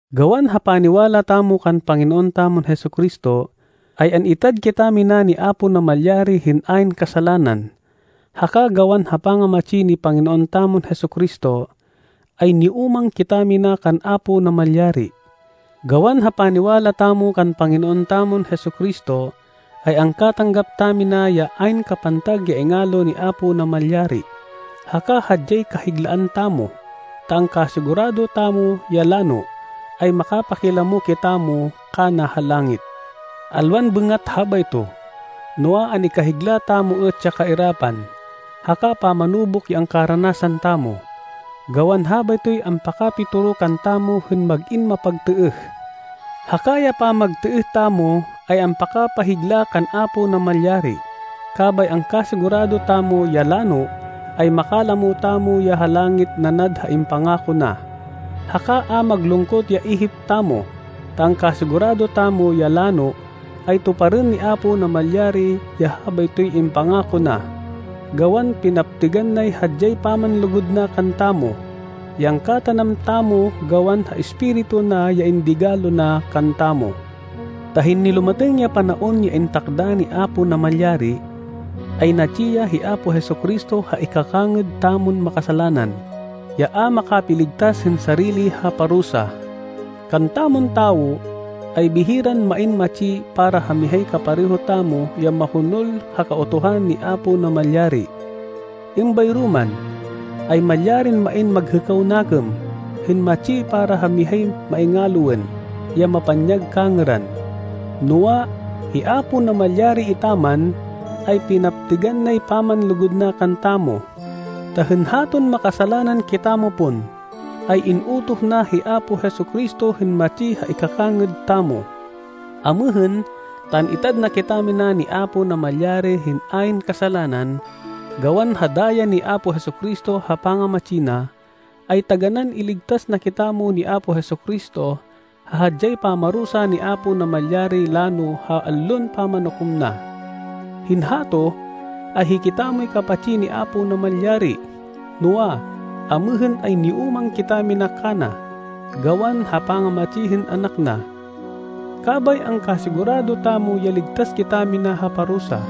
Gawan ha paniwala tamo kan Panginoon tamon Jesu-Cristo, ay an-itad kitamina ni Apo Namalyari hên ayn kasalanan, haka gawan ha pangamatsi ni Panginoon tamon Jesu-Cristo, ay niúmang kitamina kan Apo Namalyari. Gawan ha paniwala tamo kan Panginoon tamon Jesu-Cristo, ay angkatanggap tamina ya ayn kapantag ya ingalo ni Apo Namalyari. Haka hadyay kahiglaan tamo, ta angkasigurado tamo ya lano, ay makapakilamo kitamo kana ha langit. Alwan bêngat habayto, noa, an-ikahigla tamo êt ya kairapan, haka pamanubuk ya angkaranasan tamo, gawan habaytoy ampakapitoro kantamo hên mag-in mapagtêêh. Haka ya pamagtêêh tamo, ay ampakapahigla kan Apo Namalyari, kabay angkasigurado tamo ya lano, ay makalamo tamo ya ha langit nanad ha impangako na. Haka a maglungkot ya ihip tamo, ta angkasigurado tamo ya lano, ay tuparên ni Apo Namalyari ya habaytoy impangako na, gawan pinaptêgan nay hadyay pamanlugud na kantamo, ya angkatanam tamo gawan ha Espiritu na ya indigalo na kantamo. Ta hên nilumatêng ya panaon ya intakda ni Apo Namalyari, ay natsi ya hi Apo Jesu-Cristo ha ikakangêd tamon makasalanan, ya a makapiligtas hên sarili ha parusa. Kantamon tawo, ay bihiran main matsi para ha mihay kapareho tamo ya mahonol ha Kautuhan ni Apo Namalyari, êmbayro man, ay malyarin main maghêkaw nakêm, hên matsi para ha mihay maingaloên, ya mapanyag kangêran. Noa, hi Apo Namalyari etaman, ay pinaptêgan nay pamanlugud na kantamo, ta hên haton makasalanan kitamo pon, ay in-utoh na hi Apo Jesu-Cristo hên matsi ha ikakangêd tamo. Amêhên, ta an-itad na kitamina ni Apo Namalyari hên ayn kasalanan, gawan ha daya ni Apo Jesu-Cristo ha pangamatsi na, ay taganán iligtas na kitamo ni Apo Jesu-Cristo ha hadyay pamarusa ni Apo Namalyari lano ha Allon Pamanukom na. Hên hato, ay hikitamoy kapatsi ni Apo Namalyari, noa, amêhên ay niúmang kitamina kana, gawan ha pangamatsi hên Anak na, kabay angkasigurado tamo ya ligtas kitamina ha parusa,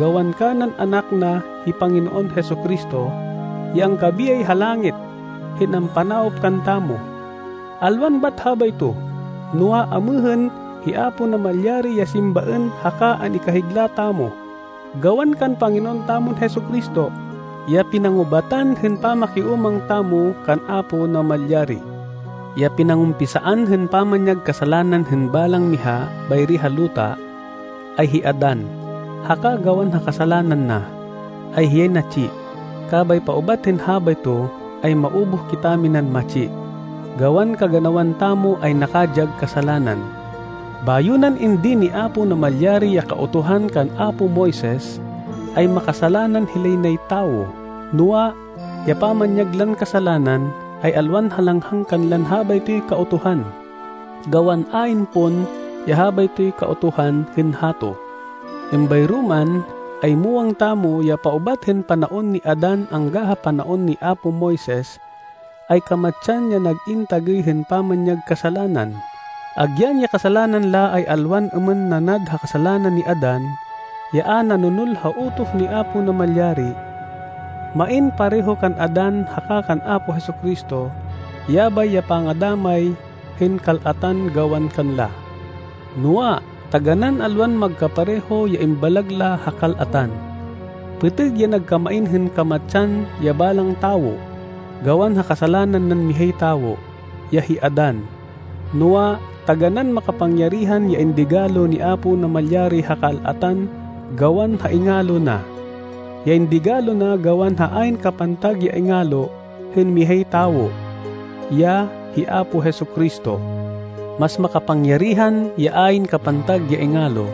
gawan kanan Anak na hi Panginoon Jesu-Cristo, ya angkabiyay ha langit hên ampanawop kantamo. Alwan bat habayto, noa, amêhên hi Apo Namalyari ya simbaên haka an-ikahigla tamo, gawan kan Panginoon tamon Jesu-Cristo, ya pinangubatan hên pamakiúmang tamo kan Apo Namalyari. Ya pinangumpisaan hên pamanyag kasalanan hên balang miha bayri ha luta, ay hi Adan, haka gawan ha kasalanan na, ay hiyay natsi. Kabay paubat hên habayto, ay maubuh kitaminan matsi, gawan kaganawan tamo ay nakadyag kasalanan. Bayo nan indin ni Apo Namalyari ya Kautuhan kan apo Moises, ay makasalanan hilay nay tawo. Noa, ya pamanyag lan kasalanan, ay alwan halanghang kanlan habaytoy Kautuhan, gawan ayn pon ya habaytoy Kautuhan hên hato. Êmbayro man, ay muwang tamo ya paubat hên panaon ni Adan angga ha panaon ni apo Moises, ay kamatsan ya nag-in tagêy hên pamanyag kasalanan, agyan ya kasalanan la ay alwan êmên nanad ha kasalanan ni Adan ya a nanonol ha utoh ni Apo Namalyari. Main pareho kan Adan haka kan Apo Jesu-Cristo, yabay ya pangadamay hên kal-atan gawan kanla. Noa, taganán alwan magkapareho ya imbalag la ha kal-atan. Pêtêg ya nagkamain hên kamatsan ya balang tawo, gawan ha kasalanan nan mihay tawo, ya hi Adan, noa, taganán makapangyarihan ya indigalo ni Apo Namalyari ha kal-atan gawan ha ingalo na, ya indigalo na gawan ha ayn kapantag ya ingalo hên mihay tawo, ya hi Apo Jesu-Cristo. Mas makapangyarihan ya ayn kapantag ya ingalo,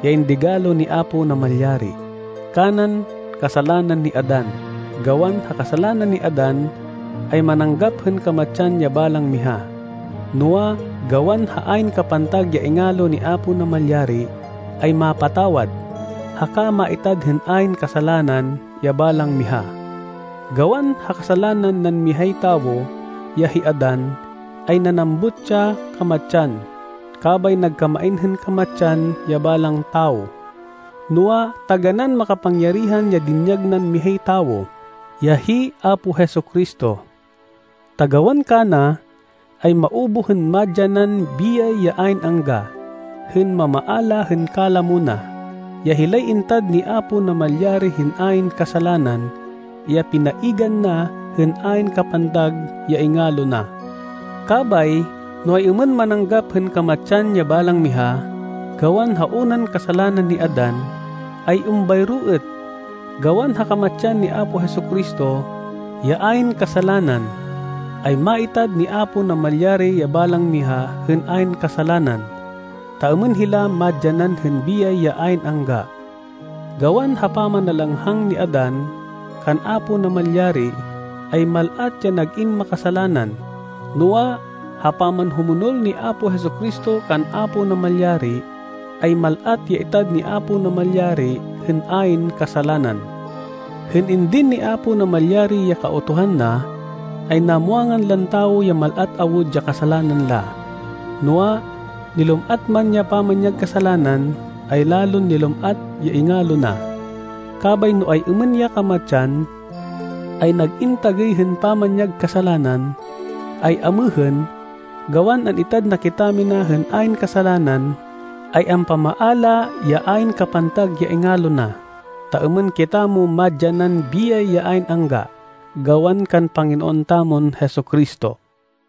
ya indigalo ni Apo Namalyari, kanan kasalanan ni Adan. Gawan ha kasalanan ni Adan, ay mananggap hên kamatsan ya balang miha. Noa, gawan ha ayn kapantag ya ingalo ni Apo Namalyari, ay mapatawad, haka maitad hên ayn kasalanan ya balang miha. Gawan ha kasalanan nan mihay tawo, ya hi Adan, ay nanambut ya kamatsan, kabay nagkamain hên kamatsan ya balang tawo. Noa, taganán makapangyarihan ya dinyag nan mihay tawo, ya hi Apo Jesu-Cristo, ta gawan kana, ay maubuh hên madyanan biyay ya ayn angga, hên mamaala hên kalamo na, ya hilay intad ni Apo Namalyari hên ayn kasalanan, ya pinaigan na hên ayn kapantag ya ingalo na. Kabay, no ay-êmên mananggap hên kamatsan ya balang miha, gawan ha unan kasalanan ni Adan, ay êmbayro êt, gawan ha kamatsan ni Apo Jesu-Cristo, ya ayn kasalanan, ay maitad ni Apo Namalyari ya balang miha hên ayn kasalanan, ta êmên hila madyanan hên biyay ya ayn angga. Gawan ha pamanalanghang ni Adan, kan Apo Namalyari, ay mal-at ya nag-in makasalanan, noa, ha pamanhumonol ni Apo Jesu-Cristo kan Apo Namalyari, ay mal-at ya itad ni Apo Namalyari hên ayn kasalanan. Hên indin ni Apo Namalyari ya Kautuhan na, ay namwangan lan tawo ya mal-at awud ya kasalanan la. Noa, nilum-at man ya pamanyag kasalanan, ay lalon nilum-at ya ingalo na. Kabay no ay-êmên ya kamatsan ay nag-in tagêy hên pamanyag kasalanan, ay amêhên, gawan an-itad na kitamina na hên ayn kasalanan, ay ampamaala ya ayn kapantag ya ingalo na, ta êmên kitamo madyanan biyay ya ayn angga, gawan kan Panginoon tamon Jesu-Cristo.